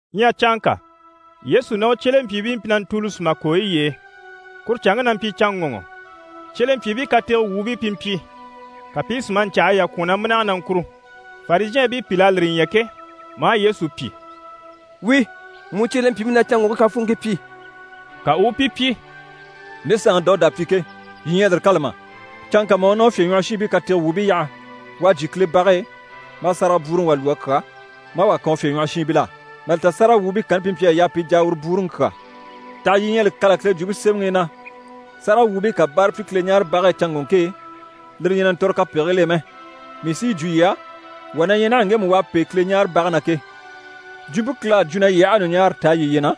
Ɲyɛ canŋka, Yesu ná u cyelempyiibii mpyi na ntùuli sùma kooyi y'e, kuru canŋke na mpyi canŋɔŋɔ. Cyelempyiibii katege wuubii pi mpyi, ka pi i sùmaɲcahayi yà kwɔ̀n na mínage na ŋkùru. Farizhɛɛnbii pìl'à lire ɲya ke, maa Yesu pyi: «Wíi, mu cyelempyiibii na canŋɔŋke kafuunŋkii pyi!» Ka u u pi pyi: «Nde Saanŋi Dawuda à pyi ke, yii ɲyɛ a lire kâla mà? Canŋka mà u ná u fyèɲwɔhɔshiinbii katege wuubii yaha, u à jyè Kile bage e, maa sárage bwúuruŋi wà lwɔ́ a kyà, maa wà kan u fyèɲwɔhɔshiinbil'á. Mà li ta sáragawwuubii kanni pi mpyi a yaa pi jà a uru bwúuruŋi kyà. Taha yii ɲyɛ a li kâla Kile Jwumpe Semɛŋi i na sáragawwuubii ká báara pyi Kileɲaarebage e canŋɔŋke e, lire ɲyɛ na ntɔ̀re kapegigil'e mɛ? Mii sí yi jwo yii á, wà na ɲyɛ naha ŋgemu u à pêe Kileɲaarebage na ke. Jwumpe Kile à jwo na yii aha a ɲùɲaara taa yiye na,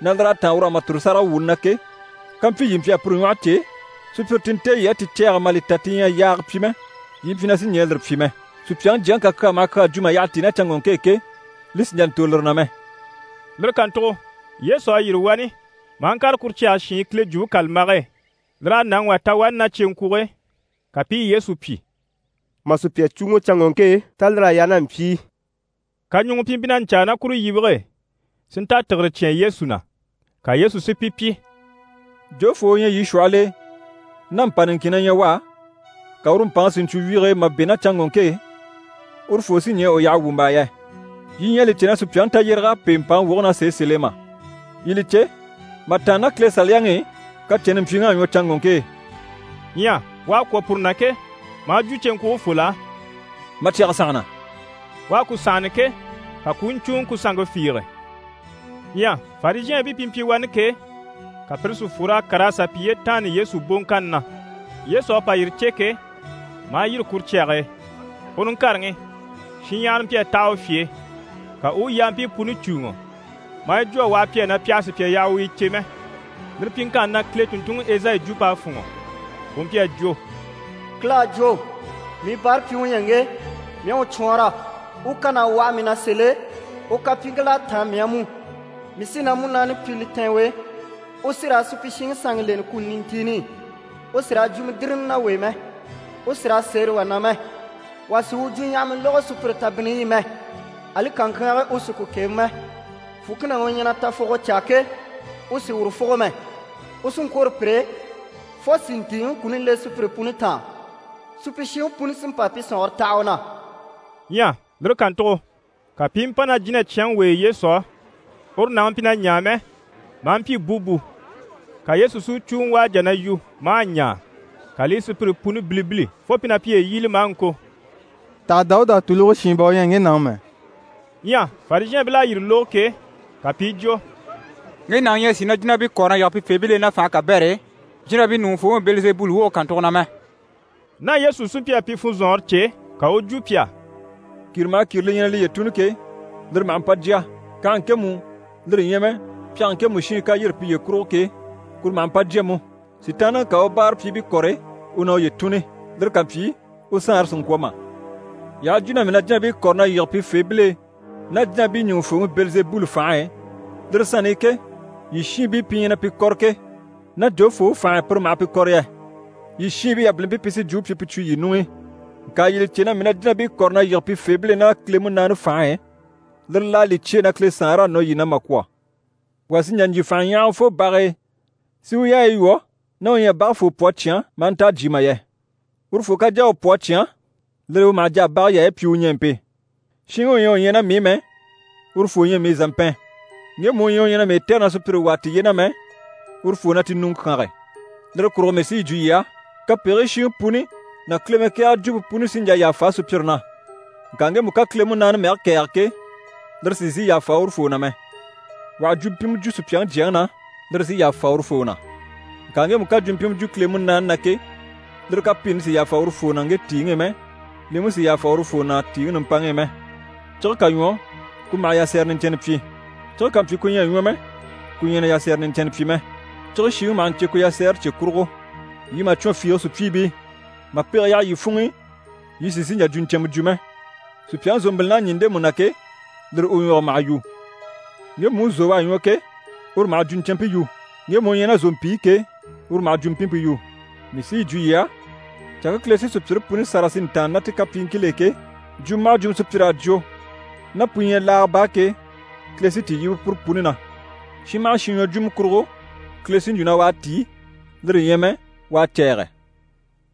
na lir'à táan ur'á mà tòro sáragawwuuni na ke, kampyi yii mpyi a puru ɲwɔhe cè, sùpyire ti nte yii à ti cɛ̂ɛgɛ mà li ta ti ɲyɛ a yaaga pyi mɛ, yii mpyi na sì ɲɛɛ lire pyi mɛ. Supyaŋi Jyaŋi ká kyaa maha kyaa jwo mà yyaha tíi ná canŋɔŋke e ke, li sì n‑jà n‑tòro lire na mɛ.» Lire kàntugo Yesu à yîri wani, maa ŋkàre kuru cyage shiin Kile Jwumpe kàlambage e. Lir'à nàŋi wà ta wani ná cyeŋkwuge e. Ka pi i Yesu pyi: «Mà sùpya cùuŋɔ canŋɔŋke e, tá lir'à yaa ná mpyi i?» Kaɲuŋɔ pi mpyi na ɲcaa ná kuru yibige e, si nta tìgire cyán Yesu na. Ka Yesu si pi pyi: «Jofoo u ɲyɛ yii shwɔhɔl'e, ná mpà niŋkin na ɲyɛ u á, ka uru mpàŋi si ɲcwo wyige e mà bɛ̂ ná canŋɔŋke e, urufoo sí ɲɛɛ u yaha wwùmbaa yɛ? Yii ɲyɛ a li cè na sùpyaŋi tayyéreg'à pêe mpàŋi woge na sèe sèl'e mà? Yii li cè, mà tàanna ná Kile Saliyaŋi i, kacɛnni mpyiŋ'à ɲwɔ canŋɔŋke e.» Ɲyɛ u à kwɔ̀ puru na ke, maa jwo cyeŋkwugefol'á: «Ma cyɛge sànhana.» U à ku sànhana ke, ka ku u ɲcùuŋɔ ku sanŋke fiige. Ɲyɛ Farizhɛɛnbii pi mpyi wani ke, ka pire si fwor'a kàr'a sà piye taanna Yesu boŋkanni na. Yesu à pa yire cè ke, maa yîri kuru cyage e, u niŋkareŋi, shinɲyahara mpyi a taha u fye e, ka u u yampii puni cùuŋɔ. Maa yi jwo a waha pi á na pi àha sùpya yaha u yi cè mɛ. Lire pyiŋkanni na, Kile tùnntunŋi Ezayi jwump'à fûnŋɔ, u mpyi a jwo: «Kile à jwo: “Mii báarapyiŋi u ɲyɛ ŋge, mii à u cwɔɔnrɔ. U kan'à waha mii na sèl'e, u kapyiiŋkil'à táan mii á mú. Mii sí na Munaani pyi li tɛ̀ɛn u e, u sí raa supyishiŋi sanŋi leni kuni nintiini i. U sì raa jwumɔ dìrili ná wà e mɛ, u sì raa sêre wà na mɛ. Wà sì u jwuɲyahama lógo sùpyire tabinniyi i mɛ. Ali kaŋkyaange, u sì ku kebe mɛ, fùkinaŋi u ɲyɛ na tafuguyo caa ke, u sì uru fùgo mɛ. U sí n‑kwôro pur'e, fo si ntìiŋi kuni le sùpyire puni taan. Supyishiŋi puni sí n‑pa pi sɔ̀nŋɔre taha u na.”» Ɲyɛ lire kàntugo, ka pi i mpa ná jínacyanŋi w'e Yesu á. Uru nàŋi mpyi na ɲaa mɛ, maa mpyi búbu. Ka Yesu si u cùuŋɔ u à jà na yu maa ɲaa. Ka li i sùpyire puni bilibili fo pi na piye yíbili maa ŋko: «Taha Dawuda Tuluge Shin bà u ɲyɛ ŋge nàŋi mɛ?» Ɲyɛ Farizhɛɛnbil'à yire lógo ke, ka pi i jwo: «Ŋge nàŋi ɲyɛ a sìi na jínabii kɔ̀re na yige pifeebil'e ná fànhe kabɛr'e, jínabii ɲùŋufooŋi Bɛlizebuli woge kàntugo na mɛ!» Ná Yesu sí mpyi a pi funzɔnŋɔre cè, ka u u jwo pi á: «Kìre maha kìre li ɲyɛ na liye tùnni ke, lire maha mpa jya. Kànhe ŋkemu, lire ɲyɛ mɛ pyɛnge ŋkemu shiin ká yîri piye kurugo ke, kuru maha mpa jya mú. Sitaanniŋi ká a u báarapyiibii kɔ̀re, u na uye tùnni. Lire ká mpyi, u saanre sì n‑kwɔ̀ mà? Yii aha jwo na mii na jínabii kɔ̀re na yige pifeebil'e ná jínabii ɲùŋufooŋi Bɛlizebuli fànhe e, lire sanni i ke, yii shiinbii pi ɲyɛ na pi kɔ̀re ke, ná jofoo u fànhe e pire maha pi kɔ̀re yɛ? Yii shiinbii yabilimpii pi sí jwumpe pyi pu cwo yii ɲuŋ'i. Ŋka yii li cè na mii na jínabii kɔ̀re na yige pifeebil'e ná Kile Munaani fànhe e, lir'à li cyêe na Kile Saanre à nɔ yii na mà kwɔ̀. Wà sì n‑jà n‑jyè fànhaɲyahagafoo bage e, si u yaayi lwɔ́, ná u ɲyɛ a bage foo pwɔ a cyán maa nta a jyè mà yɛ. Urufoo ká jà a u pwɔ a cyán, lire e u maha jà a bage yaayi pyi u ɲɛɛmpe. Shinŋi u ɲyɛ u ɲyɛ ná mii i mɛ, urufoo ɲyɛ mii zàmpɛn, ŋgemu u ɲyɛ u ɲyɛ na mii tɛ̀re na sùpyire wàa tiye na mɛ, urufoo na ti ɲùŋɔ kyánge. Lire kurugo mii sí yi jwo yii á: kapegigii shiŋi puni ná Kile mɛkɛɛgɛ jwumpe puni sí n‑jà yàfa sùpyire na. Ŋka ŋgemu ká Kile Munaani mɛge kɛ̀ɛge ke, lire sì n‑sìi yàfa urufoo na mɛ. Wà ha jwumpimɛ jwo Supyaŋi Jyaŋi na, lire sí yàfa urufoo na. Ŋka ŋgemu ká jwumpimɛ jwo Kile Munaani na ke, lire kapiini sì yàfa urufoo na ŋge tìiŋi i mɛ, li mú sì yàfa urufoo na tìiŋi nimpaŋi i mɛ. Cige ká ɲwɔ, ku maha yasɛrɛ niɲcɛnnɛ pyi. Cige ká mpyi ku ɲyɛ a ɲwɔ mɛ, ku ɲyɛ na yasɛrɛ niɲcɛnnɛ pyi mɛ. Cige shiŋi maha ɲcè ku yasɛɛre cye kurugo. Yii màcwɔn fiige sùpyiibii! Mà pege yaha yii funŋ'i, yii sì n‑sìi n‑jà jwuɲcɛnmɛ jwo mɛ. Sùpyaŋi zòmbilin'à ɲî ndemu na ke, lire u ɲwɔge maha yu. Ŋgemu u zò u à ɲwɔ ke, uru maha jwuɲcɛnmpe yu. Ŋgemu u ɲyɛ ná zòmpi i ke, uru maha jwumpimpe yu. Mii sí yi jwo yii á, canŋke Kile sí sùpyire puni sâra si ntàanna ná ti kapyiiŋkil'e ke, jwumɔ maha jwumɔ sùpyir'à jwo, ná pu ɲyɛ laaga baa ke, Kile sí ti yíbe puru puni na. Shin maha shin ɲwɔjwumɔ kurugo, Kile sí n‑jwo na u à tíi, lire ɲyɛ mɛ u à cɛ̂ɛgɛ.»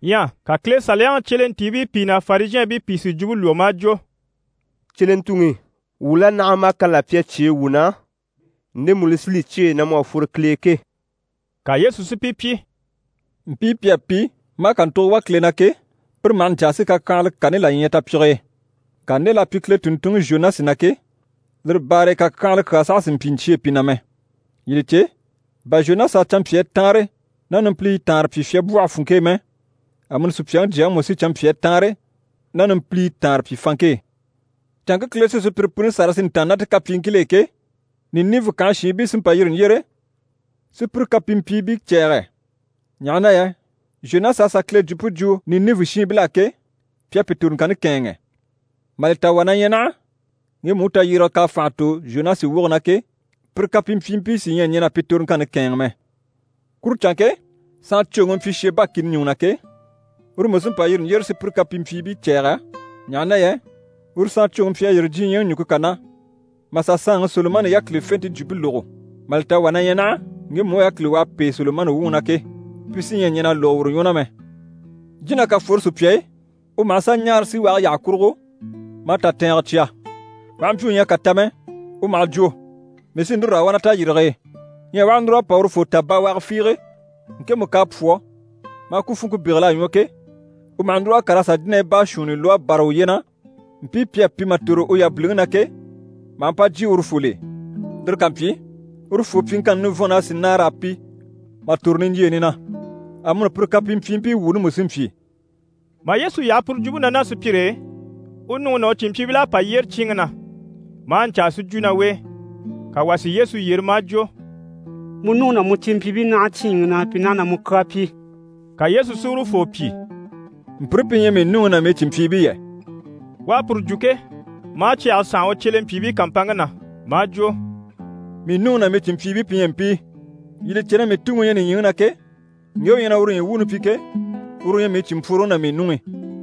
Ɲyɛ ka Kile Saliyaŋi cyelentiibii pìi ná Farizhɛɛnbii pìi si jwumpe lwɔ́ maa jwo: «Cyelentuŋi, wuu la naha maa kani là pyi a cyêe wuu na, ndemu li sí li cyêe na mu à fworo Kile e ke.» Ka Yesu si pi pyi: «Mpii pi à pi, maa kàntugo wà Kile na ke, pire maha ɲcaa si kakyanhala kani là ɲya tapyige e. Ŋka nde l'à pyi Kile tùnntunŋi Zhonasi na ke, lire baare e kakyanhala kyaa saha sì n‑pyi n‑cyêe pi na mɛ. Yii li cè, bà Zhonasi a canmpyaa taanre ná numpiliyi taanre pyi fyabwɔhe funŋke e mɛ, amuni Supyaŋi Jyaŋi mú sí canmpyaa taanre ná numpiliyi taanre pyi fanŋke e. Canŋke Kile sí sùpyire puni sâra si ntàanna ná ti kapyiiŋkil'e ke, Ninive kànhe shiinbii sí n‑pa n-yîri n‑yyére si pire kapimpyiibii cɛ̂ɛgɛ, ɲaha na yɛ Zhonasi à sà Kile jwumpe jwo Ninive shiinbil'á ke, pi à pi toroŋkanni kɛ̂ɛnŋɛ. Mà li ta wà na ɲyɛ naha, ŋgemu u tayyérege k'à fànha tò Zhonasi woge na ke, pire kapimpyiibii sí ɲyɛ a ɲɛn'a pi toroŋkanni kɛ̂ɛnŋɛ mɛ. Kuru canŋke, saancwoŋi u mpyi Sheba kìni ɲùŋɔ na ke, uru mú sí n‑pa n-yîri n‑yyére si pire kapimpyiibii cɛ̂ɛgɛ, ɲaha na yɛ uru saancwoŋi mpyi a yîri diɲyɛŋi ɲùŋke kà na, mà sà saanŋi Solomani yákilifente jwumpe lógo. Mà li ta wà na ɲyɛ naha, ŋgemu u yákili u à pêe Solomani wuŋi na ke, pi sí ɲyɛ a ɲɛn'a lógo uru ɲwɔ na mɛ. Jína ká fworo sùpya e, u maha sà ɲaara síwage yyaha kurugo maa tatɛɛngɛ cya. U aha mpyi u ɲyɛ a kà ta mɛ, u maha jwo “Mii sí núru raa wà na tayirige e.” Ɲyɛ u aha núr'a pa urufoo ta bawaga fiige, ŋkemu k'à pwɔ́, maa ku funŋke bégel'a ɲwɔ ke, u maha núr'a kàr'a sà jínahii baashuunni lwɔ́ a bâra uye na, mpii pi à pi mà tòro u yabiliŋi na ke, maha mpa jyè urufol'e. Lire ká mpyi, urufoo pyiŋkanni nivɔnn'a sì nâar'a pi mà tòro niɲjyeeni na. Amuni pire kapimpyiibii wuuni mú sí n‑pyi.» Mà Yesu yaha puru jwumpe na ná sùpyire e, u nuŋi ná u cìnmpyiibil'à pa yyére cyíinŋi na, maa ɲcaa si jwo ná u e. [ Ka wà si Yesu yyere maa jwo: «Mu nuŋi ná mu cìnmpyiibii naha cyíinŋi na, pi naha na mu kyaa pyi.»] Ka Yesu si urufoo pyi: «Mpire pi ɲyɛ mii nuŋi ná mii cìnmpyiibii yɛ?» U à puru jwo ke, maa cyɛge sànha u cyelempyiibii kàmpanŋke na, maa jwo: «Mii nuŋi ná mii cìnmpyiibii pi ɲyɛ mpii. Yii li cè na mii Tuŋi u ɲyɛ nìɲyiŋi na ke, ŋge u ɲyɛ na uru ɲyii wuuni pyi ke, uru u ɲyɛ mii cìnmpworoŋi ná mii nuŋi.»